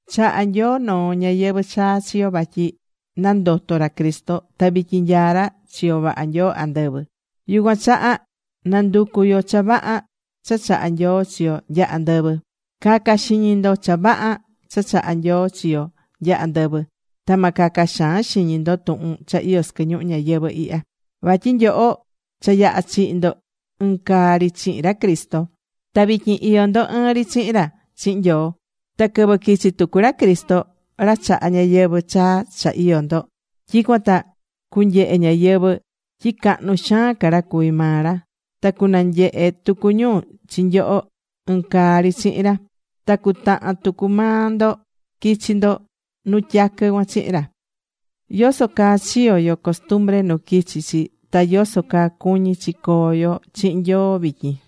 Chahá Nyoo noo ñayɨvɨ̱ chaa chi yo vatyi nandoto̱ ra Cristo. Ta vityin nyaá ra chiyo vaha Nyoo andɨvɨ. Yucuan chaha na nducu yo cha vaha cha chahá Nyoo chi yo nya andɨvɨ. Ca̱ca xiñi ndo cha vaha cha chahá Nyoo chi yo nya andɨvɨ. Ta ma caca xaan xiñi ndo tuhun cha iyó sɨquɨ ñuhu ñayɨvɨ̱ ihya. Vatyi nyoho cha yaha̱ chihi̱ ndo ɨn caa ri chihin ra Cristo. Ta vityin iyó ndo ɨɨn ri chihin ra chihin Nyoo. Ta quɨvɨ quichi tucu ra Cristo, ra chahá ñayɨvɨ̱ chaa cha iyó ndo, tyicuan ta cunyehe ñáyɨvɨ tyi cahnu xaan ca ra cuví maa ra. Ta cunanyehe tucu ñu chi nyoho ɨn caa ri chihin ra. Ta cutahan tucu maa ndo quichi ndo nu tyaquɨ cuan chihin ra.Yoso caa chiyo̱ yo costumbre nu quichi chi ta yoso caa cuñí chi coo yo chihin Nyoo vityin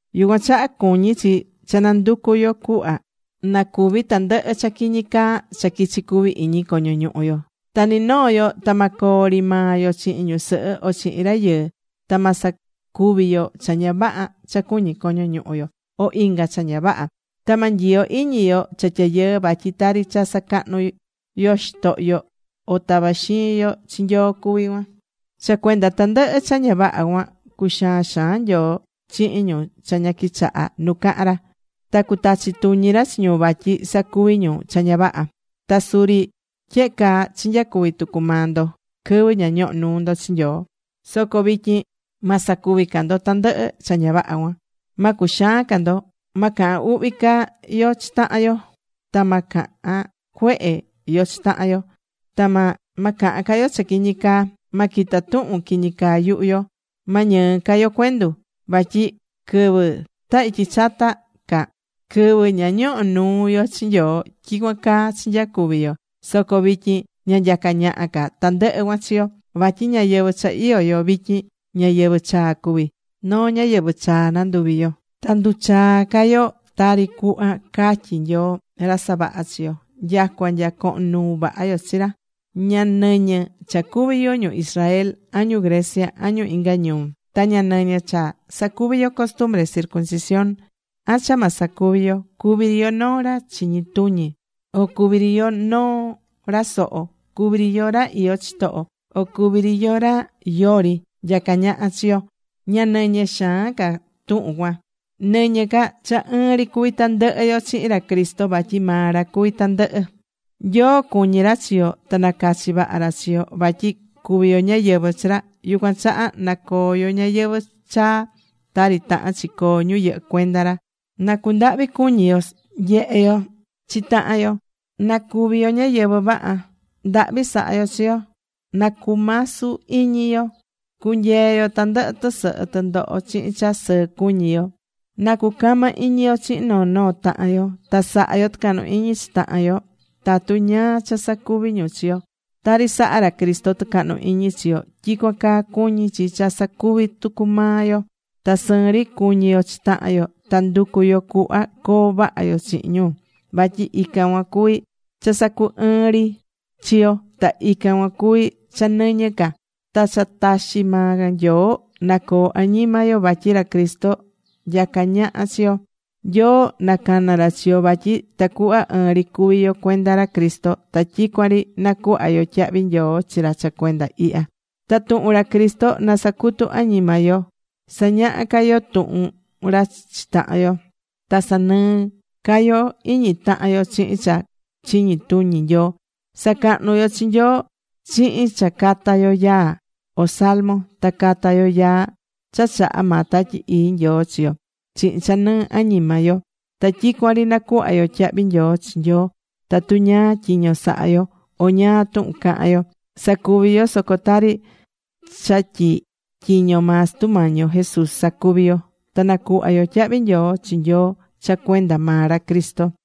Yucuan chaha cuñí chi cha nanducú yo cuhva na cúvi tandɨhɨ cha quiñi caa cha quichí cuvi iñi coño ñuhu yo. Ta ni noo yo ta ma coo ri maa yo chihin ñusɨhɨ o chihin rayɨɨ. Ta ma sacuvi yo cha ña vaha cha cuñí coño ñuhu yo, o inga cha ña vaha. Ta ma nyiyo iñi yo cha tyayɨɨ. Vatyi tari cha sacahnú yo xitohyo, o tavá xiin yo chi Nyoo cuví cuan. Cha cuenda tandɨhɨ cha ña vaha cuan cuxaán xaan Nyoo chihin ñu cha ña quichahá nu cahán ra. Ta cutachi tuñi ra chi ñu vatyi sacuví ñu cha ña vaha cuan. Ta suri tyehe caa chinyacuvi̱ tucu maa ndo quɨvɨ ña ñoho̱ nuu ndo chi Nyoo. Soco vityin ma sacuvi ca yo tandɨhɨ cha ña vaha cuan. Ma cuxaan ca yo. Ma cahan uhvi ca yo chi tahan yo. Ta ma cahan cuehe yo chi tahan yo. Ta ma cahan ca yo cha quiñi caa. Ma quita tuhun quiñi caa yuhu yo. Ma ñɨɨ ca yo cuendu. Vatyi quɨvɨ ta ityi chata ca, quɨvɨ ña ñoho̱ nuu yo chi Nyoo, tyicuan caa chinyacuvi̱ yo. Soco vityin ña nyacá ñaha ca tandɨhɨ cuan chi yo. Vatyi ñayɨvɨ̱ cha iyó yo vityin, ñayɨvɨ̱ chaa cuví. Noo ñáyɨvɨ chaa nanduvi̱ yo. Ta nduchaá ca yo tari cuhva caá Nyoo, ra savaha̱ chi yo, nyacua nya cohon nuu vaha yo chi ra. Ña nɨñɨ cha cuví yo ñu Israel, an ñu Grecia, an ñu inga ñuu. Ta ña nɨñɨ cha sacuvi̱ yo costumbre circuncisión, an cha ma sacuvi yo. Cuví ri yo noo ra chiñi tuñi o cuví ri yo noo ra soho. Cuví ri yo ra iyó chitoho, o cuví ri yo ra yori nyacá ñaha chi yo, ña nɨñɨ xaan ca tuhun cuan. Nɨñɨ ca cha ɨɨn ri cuví tandɨhɨ yo chihin ra Cristo, vatyi maa ra cuví tandɨhɨ. Nyoo cuñí ra chi yo ta nacachi̱ vaha ra chi yo vatyi cuví yo ñáyɨvɨ chi ra. Yucuan chaha na coo yo ñayɨvɨ̱ chaa tari tahán chi coo ñu yɨhɨ́ cuenda ra. Na cundahvi cuñi yo nyehé yo chi tahan yo. Na cuvi yo ñáyɨvɨ vaha. Ndahvi sa̱ha yo chi yo. Na cumasu iñi yo. Cu̱nyee yo tandɨhɨ tɨsɨhɨ tɨndoho chihin cha sɨɨ cuñí yo. Na cucama iñi yo chihin noo noo tahan yo. Ta sa̱ha yo tɨcahnu iñi chi tahan yo tatu ñáá cha sacuví ñu chi yo. Tari sahá ra Cristo tɨcahnu iñi chi yo, tyicuan caa cuñí chi cha sacuví tucu maa yo. Ta sɨɨn ri cu̱ñi yo chi tahan yo. Ta ndu̱cu yo cuhva coo vaha yo chihin ñu. Vatyi ican cuan cuví cha sacu ɨɨ́n ri chi yo. Ta ican cuan cuví cha nɨñɨ ca. Ta cha taxi maa Nyoo na coo añima yo. Vatyi ra Cristo nyacá ñaha chi yo. Nyoo nacana̱ ra chi yo vatyi tacuhva ɨɨn ri cuví yo cuenda ra Cristo. Ta tyicuan ri na̱cuhva yo tyahvi nyoo chi ra cha cuenda ihya. Ta tuhun ra Cristo na sacutu añima yo. Sa̱ñaha ca yo tuhun ra chi tahan yo. Ta sa̱nɨɨ ca yo iñi tahan yo chihin cha chiñi tuñi Nyoo. Sa̱cahnu yo chi Nyoo chihin cha cata yo yaa, o salmo. Ta ca̱ta yo yaa cha chahá maa Tatyi Ii Nyoo chi yo chihin cha nɨɨ añima yo. Ta tyicuan ri na̱cuhva yo tyahvi nyoo chi Nyoo. Tatu ñáá tyiño sahá yo, o ñáá tuhun cahán yo, sa̱cuvi yo soco tari cha tyi tyiño maa Sutu Mañi yo Jesús sacuví yo. Ta na̱cuhva yo tyahvi nyoo chi Nyoo cha cuenda maa ra Cristo.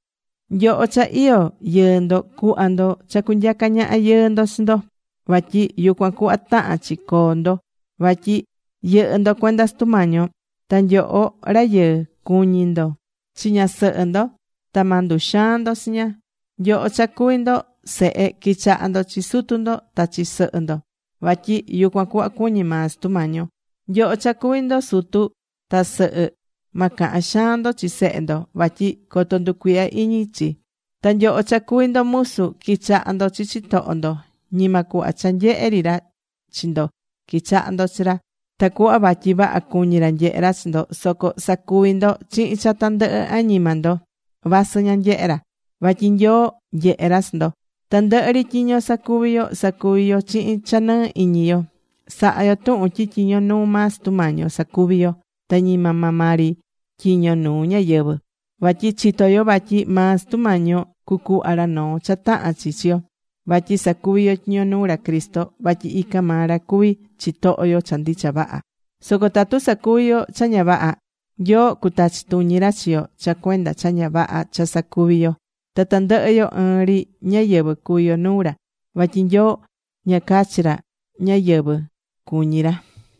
Nyoho cha iyó yɨɨ ndo, cu̱hva ndo cha cunyaca ñaha yɨɨ ndo chi ndo. Vatyi yucuan cuhva tahán chi coo ndo, vatyi yɨhɨ́ ndo cuenda Sutu Mañi yo. Ta nyoho rayɨɨ, cu̱ñi ndo chi ñasɨhɨ ndo. Ta ma nduxaan ndo chi ña. Nyoho cha cuví ndo sehe qui̱chaha ndo chi sutu ndo ta chi sɨhɨ ndo. Vatyi yucuan cuhva cuñí maa Sutu Mañi yo. Nyoho cha cuví ndo sutu ta sɨhɨ, ma cahan xaan ndo chi sehe ndo, vatyi coto nducuihya iñi chi. Ta nyoho cha cuví ndo musu, qui̱chaha ndo chi chitoho ndo. Ñima cuhva cha nyehé ri ra chi ndo qui̱chaha ndo chi ra, tacuhva vatyi vaha cuñí ra nyehe ra chi ndo. Soco sa̱cuvi ndo chihin cha tandɨhɨ añima ndo. Vasɨ ña nyehé ra. Vatyi Nyoo nyehé ra chi ndo. Tandɨhɨ ri tyiño sacuví yo, sa̱cuvi yo chihin cha nɨɨ́ iñi yo. Sa̱ha yo tuhun tyi tyiño nuu maa Sutu Mañi yo sacuví yo. Ta ñima maa ri maa tyiño nuu ñáyɨvɨ. Vatyi chitó yo vatyi maa Sutu Mañi yo cucuhva ra noo cha tahán chi chi yo vatyi sacuví yo tyiño nuu ra Cristo. Vatyi ican maa ra cuví chitoho yo cha ndicha vaha. Soco tatu sacuví yo cha ña vaha, Nyoo cutachi tuñi ra chi yo cha cuenda cha ña vaha cha sacuví yo. Ta tandɨhɨ yo ɨɨn ri ñáyɨvɨ cuví yo nuu ra. Vatyi Nyoo ña cachi ra ñáyɨvɨ cuñí ra.